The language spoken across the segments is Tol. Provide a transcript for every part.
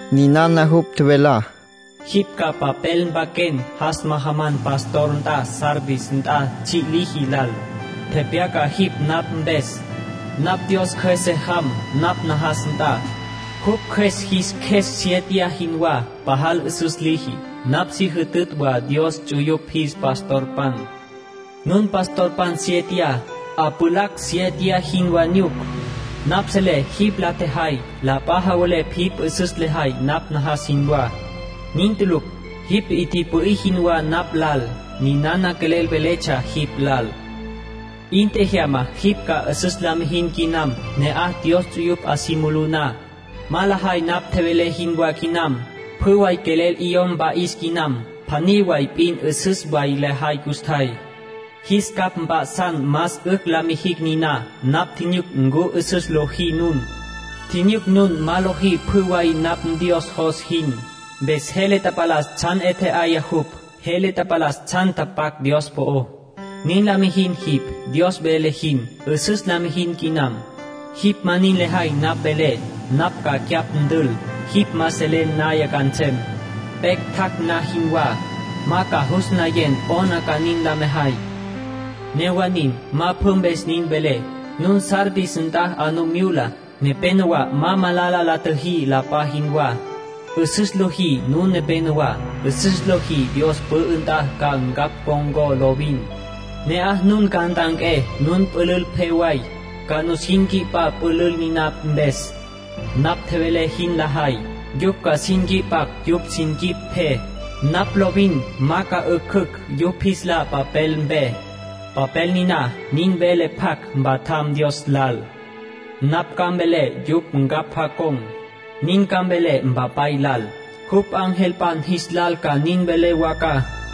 Ninana jupj tjevelá: “Jipj ca papel mpaquen, jas majaman pastor nt'a Sardis nt'a tsji' liji lal. Tepyaca jipj napj mpes: Napj Dios Cjües se jam, napj najas nt'a. Jupj Cjües jis qjues siéteya jinwá; pajal 'üsüs liji. Napj si jütütj wa Dios ts'uyupj jis pastorpan. Nun pastorpan siéteya, 'a pjulacj siéteya jinwá nyuc. Napj selé jipj la tjejay. La p'a javelepj jipj 'üsüs lejay napj najas jinwá. Nin tulucj. Jipj 'i tipü'í jinwá napj lal. Ninana quelel veletsja jipj lal. 'In tjejyama jipj ca 'üsüs la mijin quinam. Ne'aj Dios ts'uyupj 'a si mulú na, ma lajay napj tjevelé jinwá quinam. Pjü way quelel yo' mpa'is quinam. Pjaní way p'in 'üsüs way lajay custjay. Jis capj mp'a'san más 'ücj la mijicj niná. Napj tjinyuc ncu 'üsüs lojí nun. Tjinyuc nun ma lojí pjü way napj Ndios jos jin. Mpes jele tapalas tsjan 'e tje'aya jupj. Jele tapalas tsjan tjapjac' Dios po'ó. Nin la mijin jipj, Dios vele jin. 'Üsüs la mijin quinam. Jipj ma nin lejay napj velé, napj ca cyapj ntül. Jipj ma selen naya ca nsem, pecj tjac' na jinwá. Ma ca jus nlayen 'ona ca nin la mejay. Newa nin, ma pjü mpes nin velé. Nun Sardis nt'a 'a nu myula, nepénowa ma malala la tjüjí, la p'a jinwá. 'Üsüs lojí nun nepenowá. 'Üsüs lojí, Dios pü'ü nt'a ca ncapj ncon̈có lovin. Ne'aj nun ca nta'é nun pülül pje way, ca nusin nqui'pá pülül niná mpes. Napj tjevelé jin lajay, yupj ca sin nqui'pacj yupj sin quip pje. Napj lovin ma ca 'ücjücj yupj jis lá papel mpe, papel niná nin vele pjacj mpatjam Dios lal. Napj ca mvelé yupj ncapj jacon̈. Nin ca mvelé Mpapay lal, jupj angelpan jis lal ca nin mvelé wa ca.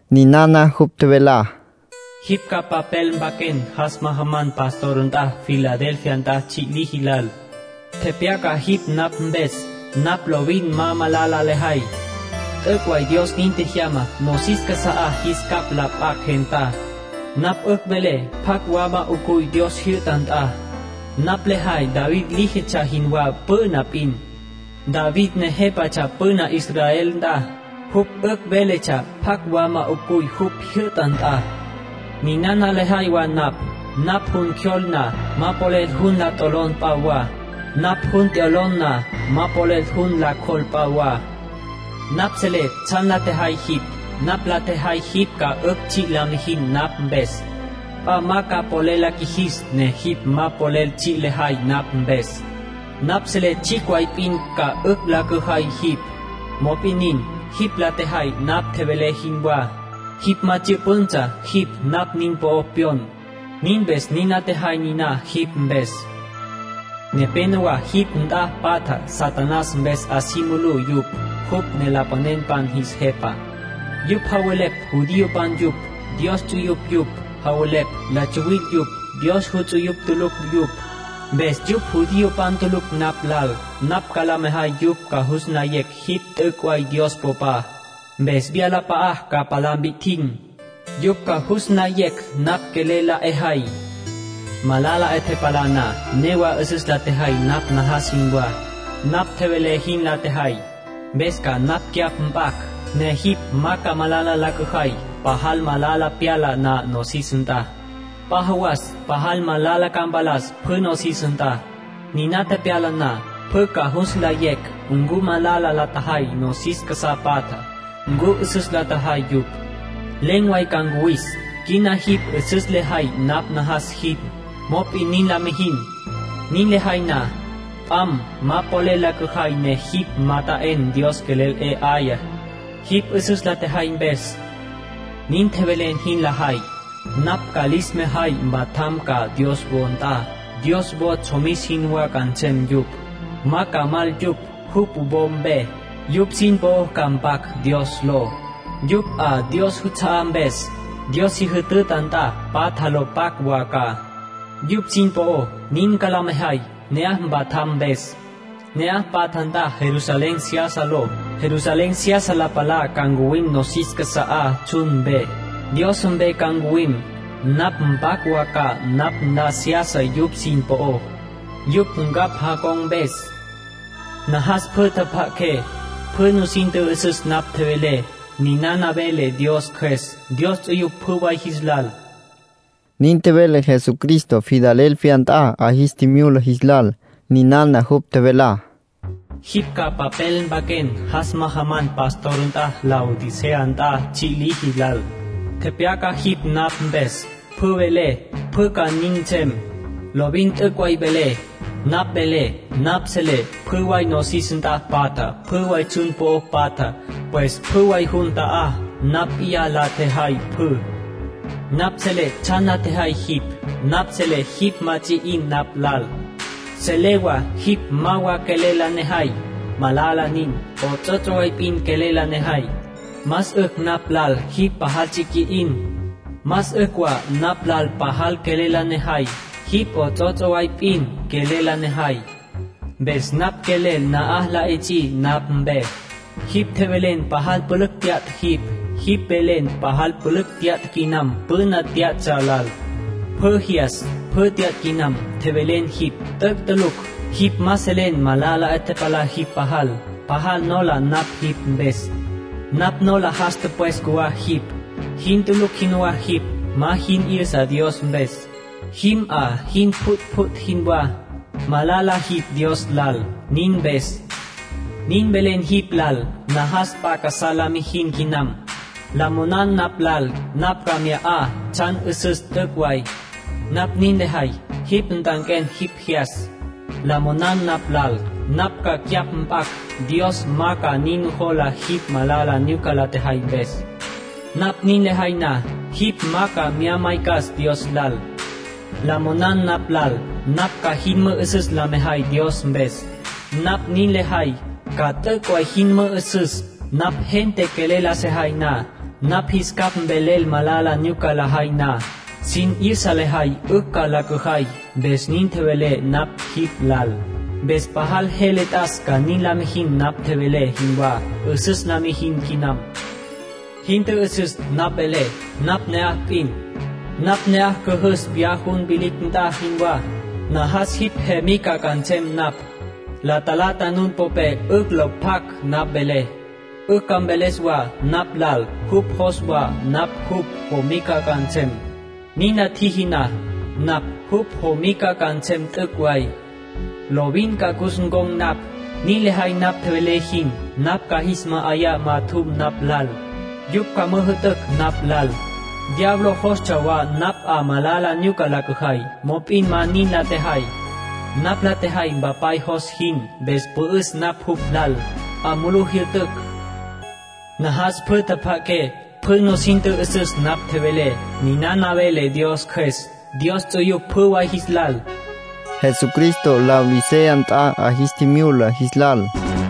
Ninana jupj tjevelá: “Jipj ca papel mpaquen, jas majaman pastor nt'a Filadelfia nt'a tsji' liji lal. Tepyaca jipj napj mpes: Napj lovin ma malala lejay. T'üc' way Dios nin tjejyama nosis casa'á jis capj la p'acj gentá. Napj 'ücj velé pjacj wama cuy Dios jyü'ta nt'a. Napj lejay David líjitsja jinwá püna p'in. David ne jépatsja püná Israel nt'a. Jupj 'ücj véletsja pjacj wama cuy jupj tjijyü'ta nt'a. Ninana lejay wa napj. Napj jun cjyol na, ma polel jun la t'olon p'a wa. Napj jun t'yolon na, ma polel jun la cjol p'a wa. Napj selé tsjan la tjejay jipj. Napj la tjejay jipj ca 'ücj tsji' la mijin napj mpes. P'a ma ca polel la qjuijis ne jipj ma polel tsji' lejay napj mpes. Napj selé tsjicj way p'in ca 'ücj la cüjay jipj; mop'in nin, jipj la tjejay napj tjevelé jinwá. Jipj ma tsyüpüntsja jipj napj nin po'ó pyon. Nin mpes nin la tjejay niná jipj mpes. Nepénowa jipj nt'a patja, Satanás mpes 'a si mulú yupj, jupj ne lapanenpan jis jepa. Yupj javelepj judiopan yupj. Dios ts'uyupj yupj, javelepj. La tsuwil yupj. Dios juts'uyupj tulucj yupj, mpes yupj judiopan tulucj napj lal. Napj ca la mejay yupj ca jus nlayecj jipj t'üc' way Dios popa. Mpes wyalap'a'a ca palá mpi'tjin̈. Yupj ca jus nlayecj napj quelel la 'ejay. Malala 'e tepalá na, newa 'üsüs la tjejay napj najas jinwá. Napj tjevelé jin la tjejay. Mpes ca napj cyapj mp'acj, ne jipj ma ca malala la cüjay pajal malala pyala na nosis nt'a. P'a jawas pajal malala ca mpalas pjü nosis nt'a. Niná tepyala na, pjü ca jus nlayecj ncu malala la tjajay nosis casá patjá, ncu 'üsüs la tjajay yupj. Len̈ way ca ncuwis. Quina jipj 'üsüs lejay napj najas jin. Mop'in nin la mijin. Nin lejay na, p'am ma polel la cüjay ne jipj ma nta'en Dios quelel 'e 'ayá, jipj 'üsüs la tjejay mpes. Nin tjevelé jin lajay, napj ca lis mejay mpatjam ca Dios wo nt'a. Dios wo tsjomis jinwá ca nsem yupj. Ma ca mal yupj jupj wo mpe. Yupj sin po'ó ca mpac Dios ló, yupj 'a Dios juts'a'á mpes. Dios si jütüta nt'a patja ló mpac wa ca, yupj sin po'ó. Nin ca la mejay, ne'aj mpatjam mpes. Ne'aj patja nt'a Jerusalén Seyasa ló. Jerusalén Seyasa la palá ca ncuwim nosis casa'á tsjun mpe. Dios mpe ca ncuwim. Napj mpac wa ca napj nlá seyasa yupj sin po'ó, yupj ncapj jacon̈ mpes. Najas pjü tjapja'aqué, pjü nusin tjü'üsüs napj tjevelé. Ninana vele Dios Cjües Dios ts'uyupj pjü way jis lal”, nin tjevele Jesucristo Filadelfia nt'a 'a jis tjimyula jis lal. Ninana jupj tjevelá: “Jipj ca papel mpaquen, jas majaman pastor nt'a Laodicea nt'a tsji' liji lal. Tepyaca jipj napj mpes: Pjü velé, pjü ca nin nsem. Lovin t'üc' way velé. Napj velé napj selé. Pjü way nosis nt'a patja, pjü way tsjun po'o patja, pues pjü way jun ta'á, napj p'iyá la tjejay pjü. Napj selé tsjan la tjejay jipj. Napj selé jipj ma ts'i 'in napj lal. Selé wa jipj ma wa quelel la nejay. Malala nin, 'ots'ots' way p'in quelel la nejay. Más 'ücj napj lal jipj pajal ts'i qui'in. Más 'ücj wa napj lal pajal quelel la nejay. Jipj 'ots'ots' way p'in quelel la nejay. Mpes napj quelel na'aj la 'i ts'i napj mpe. Jipj tjevelen pajal pülücj tyatj jipj. Jipj velen pajal pülücj tyatj quinam püna tyatsja lal. Pjü jyas, pjü tyatj quinam, tjevelen jipj. T'üc' tulucj. Jipj ma selen malala 'e tepalá jipj pajal. Pajal nola napj jipj mpes. Napj nola jas tüpwes cjuwá jipj. Jin tulucj jinwá jipj, ma jin 'yüsa Dios mpes. Jipj 'a jin pjütpjüt' jinwá. Malala jipj Dios lal. Nin mpes nin velé jipj lal, najas p'a casá la mijin quinam. La monan napj lal napj ca mya 'a tsjan 'üsüs t'üc' way. Napj nin lejay, jipj nt'anquen jipj jyas. La monan napj lal napj ca cyapj mp'acj Dios ma ca nin jola jipj malala nyuca la tjejay mpes. Napj nin lejay na, jipj ma ca mya maycas Dios lal. La monan napj lal napj ca jin mü'üsüs la mejay Dios mpes. Napj nin lejay, ca t'üc' way jin mü'üsüs. Napj gente quelel la sejay na, napj jis capj velel malala nyuca lajay na. Sin 'yüsa lejay 'ücj ca la cüjay. Mpes nin tjevelé napj jipj lal. Mpes pajal jele t'as ca nin la mijin napj tjevelé jinwá. 'Üsüs la mijin quinam. Jin tjü'üsüs napj velé. Napj ne'aj p'in, napj ne'aj cüjüs wya jun vilicj nt'a jinwá. Najas jipj jemica ca nsem napj. Latalata nun popé 'ücj lo pjac napj velé, 'ücj ca mveles wa napj lal jupj jos wa napj jupj jomica ca nsem. Nin la tjiji na, napj jupj jomica ca nsem t'üc' way. Lovin ca cus ncon̈ napj. Nin lajay napj tjevelé jin, napj ca jis ma'ayá majatjum napj lal, yupj ca müjü'tücj napj lal. Diablo jostsja wa napj 'a malala nyuca la cüjay, mop'in ma nin la tjejay. Napj la tjejay Mpapay jos jin. Mpes pü'üs napj jupj lal, 'a mulú jyü'tücj. Najas pjü tjapja'aqué, pjü nusin tjü'üsüs napj tjevelé. Ninana vele Dios Cjües Dios ts'uyupj pjü way jis lal”, nin tjevele Jesucristo Laodicea nt'a 'a jis tjimyula jis lal.